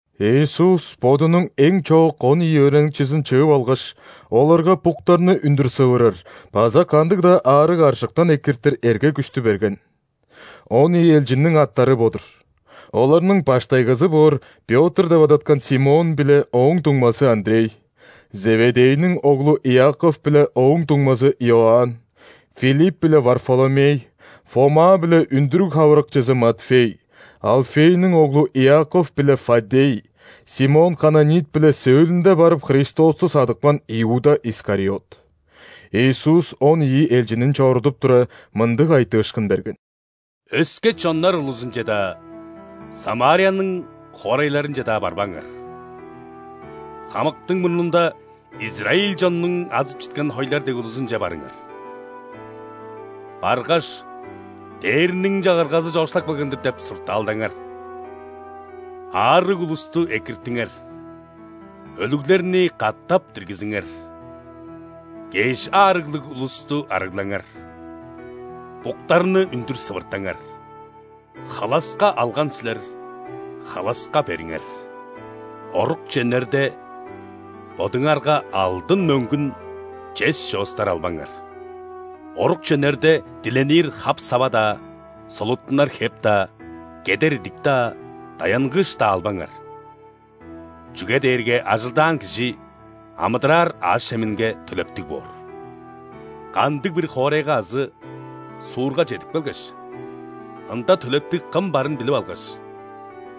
Иисус Бодунуң эң чоок он ийи өөреникчизин чыып алгаш, оларга буктарны үндүр сывырар база кандыг-даа аарыг-аржыктан экиртир эрге-күштү берген. Он ийи элчинниң аттары бо-дур: оларның баштайгызы боор Пётр деп адаткан Симон биле ооң дуңмазы Андрей, Зеведейниң оглу Иаков биле ооң дуңмазы Иоанн, Филипп биле Варфоломей, Фома биле үндүрүг хавырыкчызы Матфей, Алфейниң оглу Иаков биле Фаддей, Симон Кананит биле сөөлүнде барып Христосту садыпкан Иуда Искариот. Иисус он ийи элчинин чорудуп тура, мындыг айтыышкын берген: «Өске чоннар улузунче-даа, Самарияның хоорайларынче-даа барбаңар. Хамыктың мурнунда израиль чоннуң азып читкен хойлар дег улузунче барыңар. Баргаш: „Дээрниң Чагыргазы чоокшулап келген-дир!“ – деп суртаалдаңар. Аарыг улусту экиртиңер, өлүглерни катап диргизиңер, кеш аарыглыг улусту арыглаңар, буктарны үндүр сывыртаңар. Халаска алган силер – халаска бериңер. Орукче үнерде, бодуңарга алдын, мөңгүн, чес чоостар албаңар. Орукче үнерде, диленир хап-сава-даа, солуттунар хеп-даа, кедер идик-даа, даянгыыш-даа албаңар, чүге дээрге ажылдаан кижи амыдыраар аъш-чеминге төлептиг боор. Кандыг-бир хоорайга азы суурга чедип келгеш, ында төлептиг кым барын билип алгаш,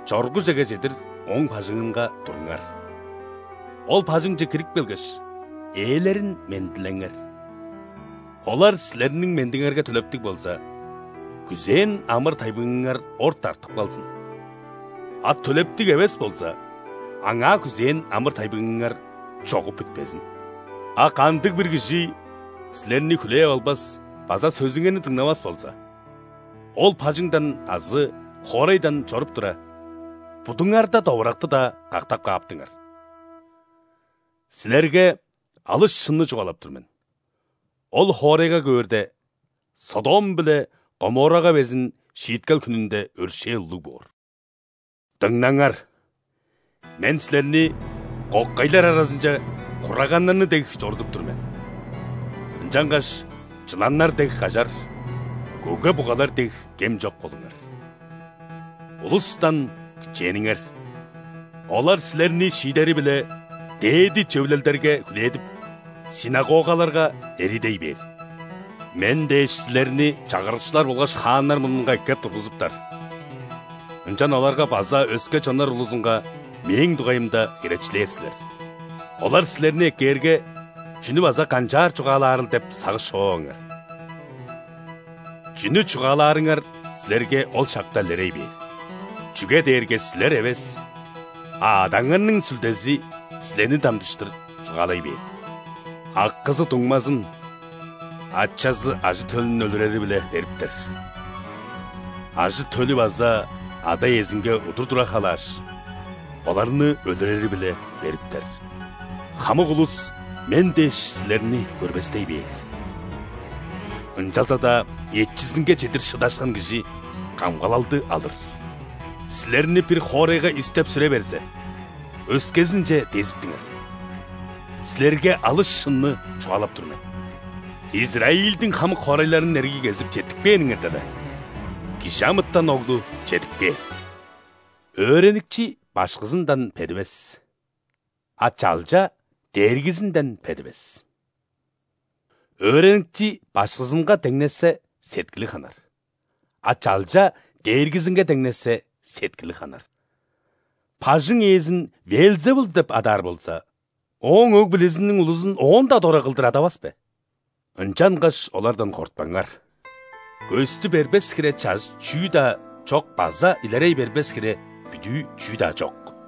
чоргужеге чедир ооң бажыңынга туруңар. Ол бажыңче кирип келгеш, ээлерин мендилеңер. Олар силерниң мендиңерге төлептиг болза, күзээн амыр-тайбыңыңар орта артып калзын, а төлептиг эвес болза, аңаа күзээн амыр-тайбыңыңар чогуп бүтпезин. А кандыг-бир кижи силерни хүлээп албас база сөзүңерни дыңнавас болза, ол бажыңдан азы хоорайдан чоруп тура, будуңарда довуракты-даа кактап кааптыңар. Силерге алыс шынны чугаалап тур мен: ол хоорайга көөрде, Содом биле Гоморрага безин шииткел хүнүнде өршээл улуг боор». «Дыңнаңар, Мен силерни кокайлар аразынче хураганнарны дег чорудуп тур мен. Ынчангаш чыланнар дег кажар, көге-бугалар дег кем чок болуңар. Улустан кичээниңер. Олар силерни шиидери-биле дээди Чөвүлелдерге хүлээдип, ·синагогаларга эриидей бээр. Мен дээш силерни чагырыкчылар болгаш хааннар мурнунга эккеп тургузуптар, ынчан оларга база өске чоннар улузунга Мээң дугайымда херечилээр силер. Олар силерни эккээрге, чүнү база канчаар чугаалаарыл деп сагыш човаваңар. Чүнү чугаалаарыңар силерге ол шакта илерей бээр. Чүге дээрге силер эвес, а Адаңарның Сүлдези силерни дамчыштыр чугаалай бээр. Акызы дуңмазын, ачазы ажы-төлүн өлүрери-биле бериптер. Ажы-төлү база ада-иезинге удур тура халааш, оларны өлүрери-биле бериптер. Хамык улус Мен дээш силерни көрбестей бээр. Ынчалза-даа эчизинге чедир шыдашкан кижи камгалалды алыр. Силерни бир хоорайга истеп-сүре берзе, өскезинче дезиптиңер. Силерге алыс шынны чугаалап тур мен: Израильдиң хамык хоорайларын эргий кезип четтикпээниңерде-ле, ·Кижи амытан Оглу чедип кээр. Өөреникчи башкызындан бедивес, а чалча дээргизинден бедивес. Өөреникчи башкызынга деңнешсе, сеткили ханар, а чалча дээргизинге деңнешсе, сеткили ханар. Бажың ээзин ·Веелзевул деп адаар болза, ооң өг-бүлезиниң улузун оон-даа дора кылдыр адавас бе? Ынчангаш олардан кортпаңар. Көстү бербес хире чажыт чүү-даа чок база илерей бербес хире бүдүү чүү-даа чок.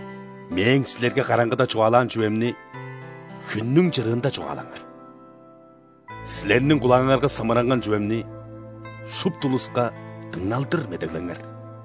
Мээң силерге караңгыда чугаалаан чүвемни хүннүң чырыында чугаалаңар, силерниң кулааңарга сымыранган чүвемни шупту улуска дыңналдыр медеглеңер.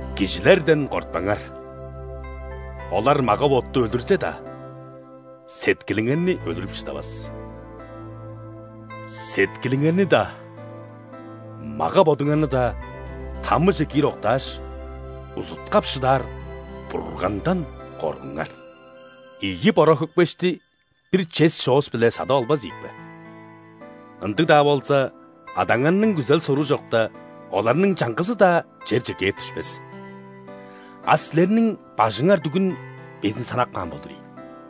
Кижилерден кортпаңар: олар мага-ботту өлүрзе-даа, сеткилиңерни өлүрүп шыдавас. Сеткилиңерни-даа, мага-бодуңарны-даа ·тамыже киир октааш, узуткап шыдаар Бургандан коргуңар. Ийи бора-хөкпешти бир чес чоос-биле садып албас ийикпе? Ындыг-даа болза, Адаңарның күзел-соруу чокта, оларның чаңгызы-даа черже кээп дүшпес. А силерниң бажыңар дүгүн безин санап каан болдур ийин!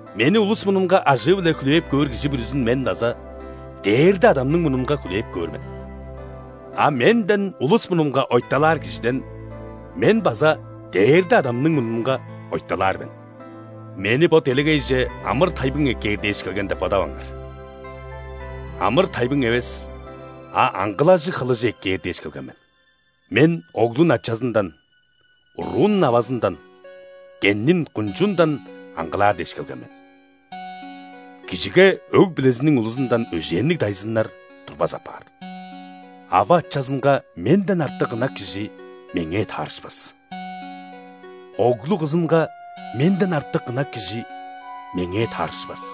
Мени улус мурнунга ажыы-биле хүлээп көөр кижи бүрүзүн Мен база Дээрде Адамның мурнунга хүлээп көөр мен. А Менден улус мурнунга ойталаар кижиден Мен база Дээрде Адамның мурнунга ойталаар мен». «Мени бо делегейже амыр-тайбың эккээр дээш келген деп бодаваңар. Амыр-тайбың эвес, а аңгылажыг хылыжы эккээр дээш келген мен. Мен оглун ачазындан, уруун авазындан, кеннин кунчуундан аңгылаар дээш келген мен. Кижиге өг-бүлезиниң улузундан өжээнниг дайзыннар турбас апаар. Ава-ачазынга Менден артык ынак кижи Меңээ таарышпас. Оглу-кызынга Менден артык ынак кижи Меңээ таарышпас.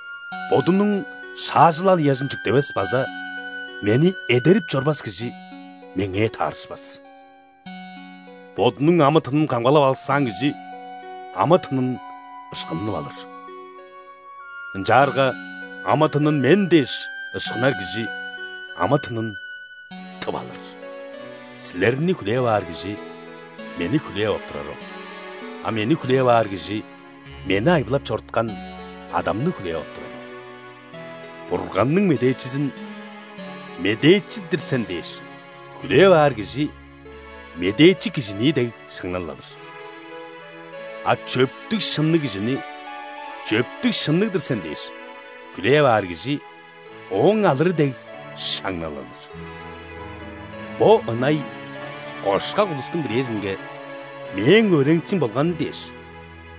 Бодунуң шаажылал ыяжын чүктевес база Мени эдерип чорбас кижи Меңээ таарышпас. Бодунуң амы-тынын камгалап алыксаан кижи амы-тынын ышкынып алыр. Ынчаарга амы-тынын Мен дээш ышкынар кижи амы-тынын тып алыр. Силерни хүлээп аар кижи Мени хүлээп ап турары ол, а Мени хүлээп аар кижи Мени айбылап чоруткан Адамны хүлээп ап турары ол. Бурганның медээчизин, медээчи-дир сен дээш, хүлээп аар кижи медээчи кижинии дег шаңнал алыр. А чөптүг-шынныг кижини, чөптүг-шынныг-дыр сен дээш, хүлээп аар кижи ооң алыры дег шаңнал алыр. Бо ынай, кошкак улустуң бирээзинге, Мээң өөреникчим болганы дээш,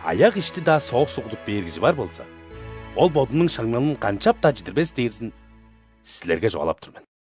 аяк ишти-даа соок суг кудуп бээр кижи бар болза, ол бодунуң шаңналын канчап-даа чидирбес дээрзин силерге чугаалап тур мен».